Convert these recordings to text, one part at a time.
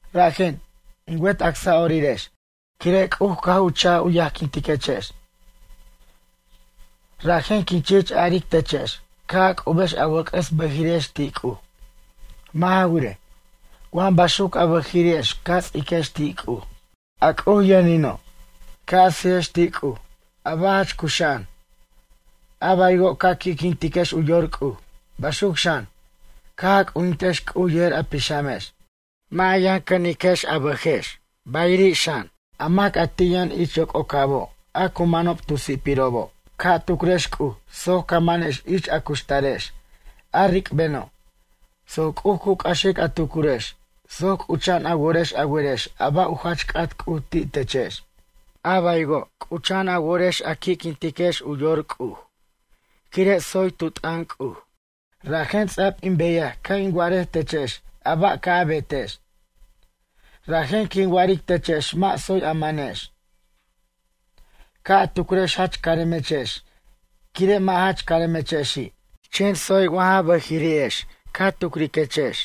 Rajen, in wet acsa'orirex, quire' C'uj caj u ch'aj u yajquintechex, rajen quin chich aric techex ca' a c'ubex a wʌc'ʌs bʌjiri'ex ti' C'uj. Mʌ' ja wirej, wa baxuc a bʌjiri'ex ca ts'iquex ti' C'uj, a C'uj yʌnino', ca' a sijex ti' C'uj, a ba' jach cuxa'an. A baywo', ca qui'quintiquex u yor C'uj, baxuc xan, caj a c'ujintex C'uj yejer a pixamex. Mʌ' a yʌn cʌniquex a bʌjex bayiri' xan a mac a ti' yʌn ich yoc'ocabo' a cu manob tu si'pirobo'. Ca' tucrex C'uj soc ca' manaquex ich a cuxtarex, a ric'beno', soc C'uj cu c'axic a tucurex soc c'ucha'an a worex a werex a ba' u jach c'at C'uj ti' techex. A baywo' c'ucha'an a worex a qui'quintiquex u yor C'uj. Quire' tsoy tu t'ʌn C'uj, rajen ts'a'b in beyaj ca' in wa'arej techex a ba' ca' a betex. Rajen quin wa'aric techex mʌ' tsoy a manex, ca' a tucrex jach caremechex, quire' mʌ' jach caremechexi'. Chen tsoy wa ja bʌjiri'ex ca tucriquechex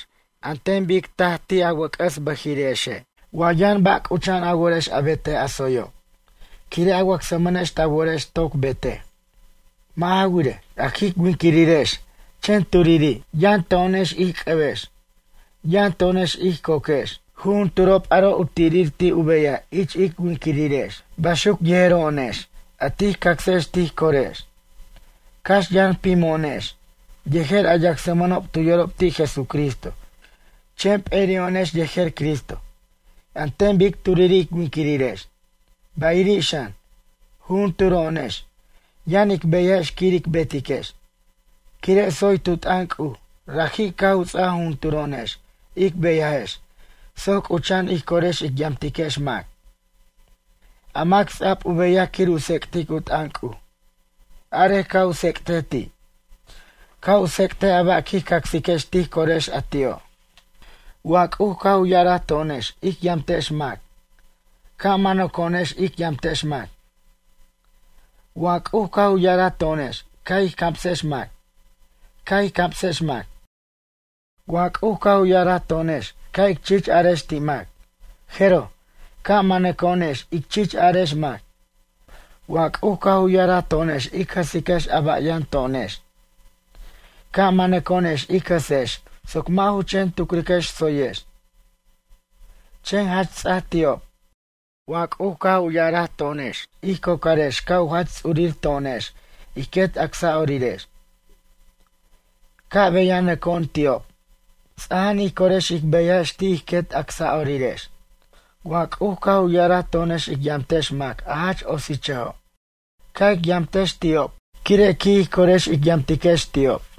an ten bic taj ti' wʌc'ʌs a bʌjiri'exe'. Wa yʌn ba' c'ucha'an a worex a betej a tsoyo', quire' a wacsmʌnex ta worex toc betej. Mʌ' ja wirej, a jic winquirirex chen turiri'. Yʌn to'onex ij c'ʌbex, yʌn to'onex ij coquex. Jujunturob aro' u tirir ti' u beyaj ich ic winquirirex. Baxuc yejero'onex, a tij cacsex tij corex. Cax yʌn pimo'onex, yejer a yacsmʌnob tu yorob ti' Jesucristo, chen p'eri'o'onex yejer Cristo, an ten bic turiri' ic winquirirex. Bayiri' xan, jujunturo'onex yʌn ic beyajex quir ic betiquex. Quire' tsoy tu t'ʌn C'uj, raji' caj u ts'aja jujunturo'onex ic beyajex soc c'ucha'an ij corex ic yamtiquex mac. A mac ts'a'b u beyaj quir u tsec'tic u t'ʌn C'uj, arej ca' u tsec'tej ti', ca' u tsec'tej a ba' quij cacsiquex tij corex a ti'o'. Wa C'uj caj u ya'araj to'onex ic yamtex mac, ca' manʌco'onex ic yamtex mac. Wa C'uj caj u ya'araj to'onex ca' ij camsex mac, ca' ij camsex mac. Wa C'uj caj u ya'araj to'onex ca' ic chich arex ti' mac, jeroj, ca' manʌco'onex ic chich arex mac. Wa C'uj caj u ya'araj to'onex ic jʌsiquex a ba' yʌn to'onex, ca' manʌco'onex ic jʌsex soc mʌ' ju chen tucriquex tsoyex. Chen jach ts'aj ti'ob. Wa C'uj caj a ya'araj to'onex ij cocarex ca' u jach ts'urir to'onex ij quet acsa'orirex, ca' beyanʌco'on ti'ob. Ts'aja'an ij corex ic beyajex ti' ij quet acsa'orirex. Wa C'uj caj u ya'araj to'onex ic yamtex mac a jach otsichʌjo'. Ca' ic yamtex ti'ob, quire' qui' ij corex ic yamtiquex ti'ob.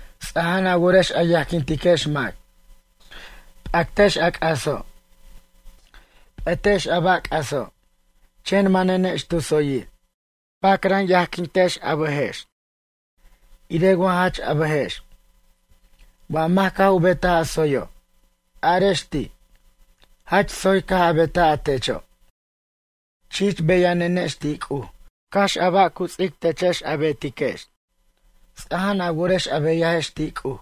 Ts'aja'an a worex a yajquintiquex mac. P'actex a c'aso'. P'ʌtex a ba' c'aso', chen manenex tu tsoyir. Pacran yajquintiquex a bʌjex, irej wa jach a bʌjex. Wa mac caj u betaj a tsoyo'. Arex ti': “Jach tsoy caj a betaj a techo'.” Chich beyanenex ti' C'uj, cax a ba' cu ts'ic techex a betiquex. Ts'aja'an a worex a beyajex ti' C'uj.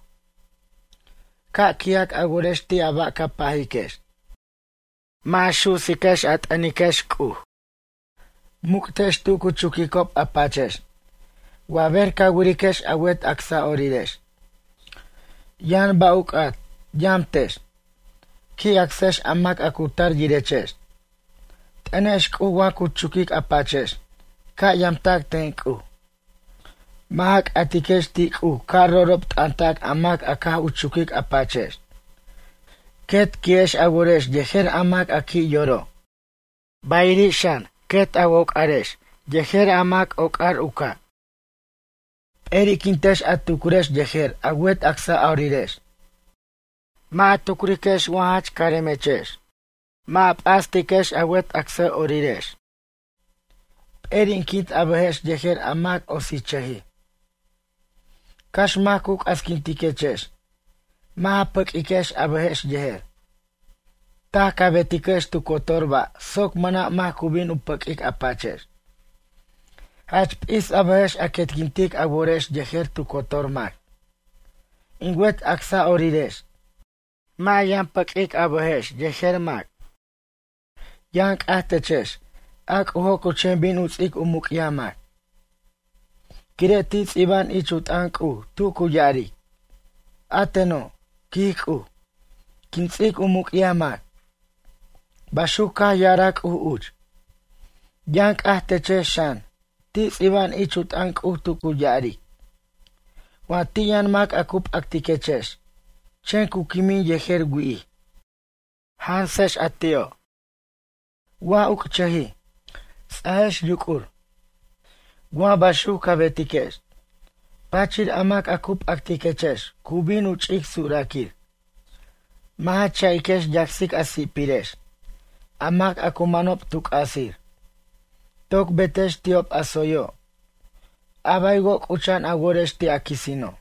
Ca' qui'ac a worex ti' a ba' ca pajiquex. Mʌ' ja su'siquex a t'ʌniquex C'uj. Muc'tex tu cu chuquicob a pachex. Wa ber ca wiriquex a wet acsa'orirex, yʌn ba' u c'at, yamtex. Qui' acsex a mac a cu tar yirechex. T'ʌnex C'uj wa cu chuquic a pachex, ca' yamtac ten C'uj. Mʌ' ja c'atiquex ti' C'uj ca' ro'ro'b t'ʌntac a mac a caj u chuquic a pachex. Quet qui'ex a worex yejer a mac a qui' yoro'. Bayiri' xan, quet a woc'arex yejer a mac ocar u ca'. Peri'quintex a tucurex yejer a wet acsa'orirex, mʌ' ja tucrex wa jach caremechex, mʌ' ja p'astiquex a wet acsa'orirex. Peri'quint a bʌjex yejer a mac otsichʌjij. Cax mac cu c'asquintiquechex, mʌ' ja pʌq'uiquex a bʌjex yejer. Taj ca betiquex tu cotor ba' soc mʌna' mac cu bin u pʌq'uic a pachex. Jach p'is a bʌjex a quetquintic a worex yejer tu cotor mac. In wet acsa'orirex, mʌ' ja yʌn pʌq'uic a bʌjex yejer mac. Yʌn c'aj techex, a C'ujo' cu chen bin u ts'ic u muc'yaj mac. Quire' ti' ts'iba'an ich u t'ʌn C'uj tu cu ya'aric: “A teno', quij C'uj, quin ts'ic u muc'yaj mac.” Baxuc caj ya'araj C'uj uch. Yʌn c'aj techex xan, ti' ts'iba'an ich u t'ʌn C'uj tu cu ya'aric: “Wa ti' yʌn mac a cu p'actiquechex, chen cu quimin yejer wi'ij, jansex a ti'o'. Wa uc'chʌjij, ts'ajex yuc'ur. Wa baxuc ca betiquex, pachir a mac a cu p'actiquechex cu bin u ch'ic suraquir.” Mʌ' ja cha'iquex yacsic a si'pirex, a mac a cu manob tu c'asir. Toc betex ti'ob a tsoyo', a baywo' c'ucha'an a worex ti' a quisino'.